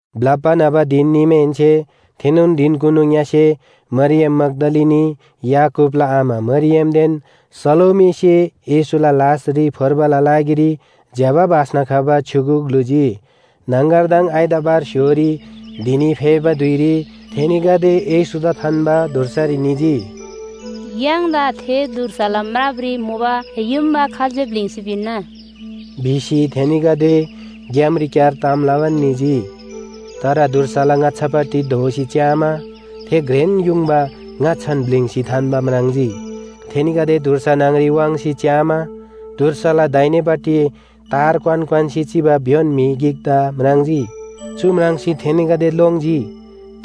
ब्‍लप्‍बा न्‍हबा धिन निमाहेन्‍से थेनोन धिनकुनु ङ्‍यसे मरियम मग्‍दलिनी, याकूबला आमा मरियमदेन सलोमीसे येशूला लासरी फोर्बाला लागिरी ज्‍यबा बास्‍ना खबा छ्‌युगु ग्‍लुजी। न्‍हङगरदङ आइतवार स्‍य्‍होरी धिनी फेबा धुइरी थेनीगदे येशूदा थान्‍बा धुर्सारी निजी। “य्‍हाङदा थे धुर्साला म्रापरी मुबा युङबा खाल्‍से ब्‍लिङ्सी पिन्‍ना?” भिसी थेनीगदे ग्‍यामरीक्‍यार ताम लबान निजी। तर धुर्साला ङाच्‍छापट्टि धोसी च्‍यामा, थे घ्रेन युङबा ङाच्‍छान ब्‍लिङ्सी थान्‍बा म्राङ्जी। थेनीगदे धुर्सा न्‍हङरी वाङ्सी च्‍यामा, धुर्साला दाहिनेपट्टि तार क्‍वान क्‍वान्‍सी चिबा भ्‍योन म्‍हि गिकदा म्राङ्जी। चु म्राङ्सी थेनीगदे लोङ्जी।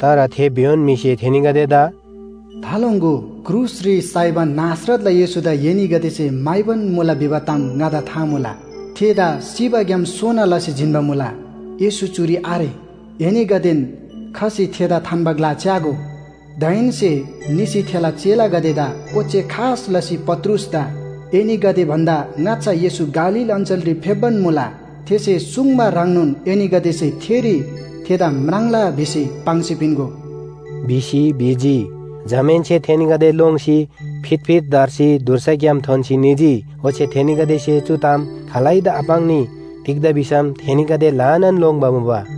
तर थे भ्‍योन म्‍हिसे थेनीगदेदा “थालोङ्‍गो! क्रुसरी साइबा नासरतला येशूदा एनीगदेसे म्‍हाइबान मुला भिबा ताम ङादा था मुला। थेदा सिबाग्‍याम सोना लसी जिन्‍बा मुला। येशू चुरी आरे। एनीगदेन खसी थेदा थान्‍बा ग्‍ला च्‍यागो। दाहेन्‍से निसी थेला चेलागदेदा ओच्‍छे खास लसी पत्रुसदा ‘एनीगदे भन्‍दा ङाच्‍छा येशू गालील अञ्‍चलरी फेप्‍बान मुला। थेसे सुङ्बा ह्रङ्नोन एनीगदेसे थेरी थेदा म्राङ्ला भिसी पाङ्सी पिन्‍गो’” भिसी भिजी। जमाहेन्‍से थेनीगदे लोङ्सी फितफित धर्सी धुर्साग्‍याम थोन्‍सी निजी। ओच्‍छे थेनीगदेसे चु ताम खालैदा आपाङ्नी। तिग्‍दा भिसम थेनीगदे ल्‍हानान लोङ्‌बा मुबा।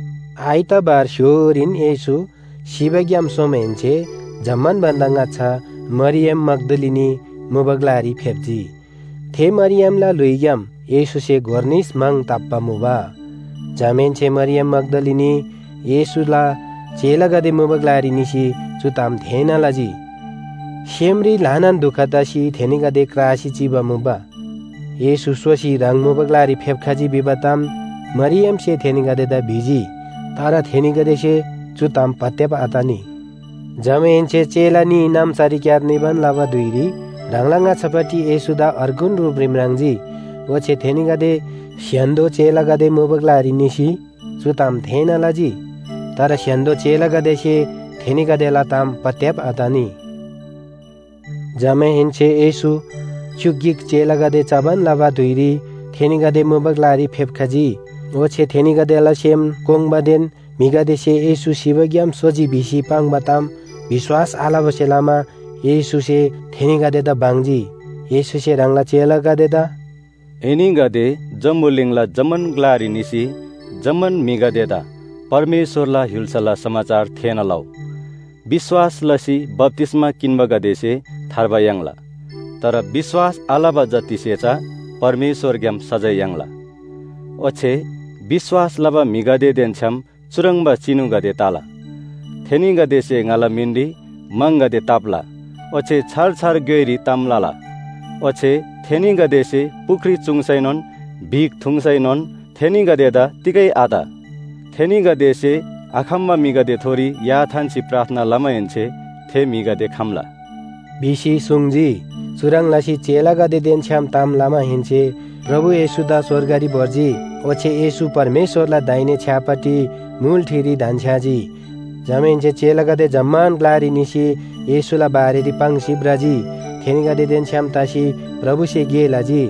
आइतवार स्‍य्‍होरीन येशू सिबाग्‍याम सोमाहेन्‍से जम्‍मान भन्‍दा ङाच्‍छा मरियम मग्‍दलिनी मुबा ग्‍लारी फेप्‍जी। थे मरियमला ल्‍हुइग्‍याम येशूसे गोर निस म्‍हङ ताप्‍बा मुबा। जमाहेन्‍से मरियम मग्‍दलिनी येशूला चेलागदे मुबा ग्‍लारी निसी चु ताम थेःना लजी। सेमरी ल्‍हानान दुख तसी थेनीगदे क्रासी चिबा मुबा। येशू सोसी ह्राङ मुबा ग्‍लारी फेप्‍खजी भिबा ताम मरियमसे थेनीगदेदा भिजी। तर थेनीगदेसे चु ताम पत्‍याब आतनी। जमाहेन्‍से चेला न्‍ही नाम्‍सारीक्‍यार निबान लबा धुइरी ह्राङला ङाच्‍छापट्टि येशूदा अर्गुन रूपरी म्राङ्जी। ओच्‍छे थेनीगदे स्‍य्‍हान्‍दो चेलागदे मुबा ग्‍लारी निसी चु ताम थेःना लजी। तर स्‍य्‍हान्‍दो चेलागदेसे थेनीगदेला ताम पत्‍याब आतनी। जमाहेन्‍से येशू च्‍युक गिक चेलागदे चबान लबा धुइरी थेनीगदे मुबा ग्‍लारी फेप्‍खजी। ओच्‍छे थेनीगदेला सेम कोङ्बादेन म्‍हिगदेसे येशू सिबाग्‍याम सोजी भिसी पाङ्बा ताम विश्‍वास आलबासे लमा येशूसे थेनीगदेदा बङ्जी। येशूसे ह्राङला चेलागदेदा “एनीगदे जम्‍बुलिङला जम्‍मान ग्‍लारी निसी जम्‍मान म्‍हिगदेदा परमेश्‍वरला य्‍हुल्‍साला समाचार थेःना लउ। विश्‍वास लसी बप्‍तिस्‍मा किन्‍बागदेसे थार्बा याङ्ला। तर विश्‍वास आलबा जतिसे चा परमेश्‍वरग्‍याम सजाय याङ्ला। ओच्‍छे विश्‍वास लबा म्‍हिगदेदेन छ्‌याम चुह्रङ्बा चिनुगदे तला थेनीगदेसे ङाला मिनरी म्‍हङगदे ताप्‍ला, ओच्‍छे छार छार ग्‍योइरी ताम लला। ओच्‍छे थेनीगदेसे पुख्री चुङ्सैनोन, बिख थुङ्सैनोन थेनीगदेदा तिगै आत। थेनीगदेसे आखम्‍बा म्‍हिगदेथोरी या थान्‍सी प्रार्थना लमाहेन्‍से थे म्‍हिगदे खम्‍ला” भिसी सुङ्जी। चुह्रङ् लसी चेलागदेदेन छ्‌याम ताम लमाहेन्‍से प्रभु येशूदा स्‍वर्गरी भोर्जी। ओच्‍छे येशू परमेश्‍वरला दाहिने छ्‌यापट्टि मुल ठिरी धन्‍छ्‌याजी। जमाहेन्‍से चेलागदे जम्‍मान ग्‍लारी निसी येशूला बारेरी पाङ्सी भ्रजी। थेनीगदेदेन छ्‌याम तसी प्रभुसे गे लजी।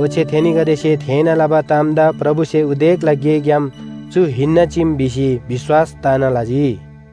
ओच्‍छे थेनीगदेसे थेःना लबा तामदा प्रभुसे उदेकला गेग्‍याम चु हिन्‍ना चीम भिसी विश्‍वास तना लजी।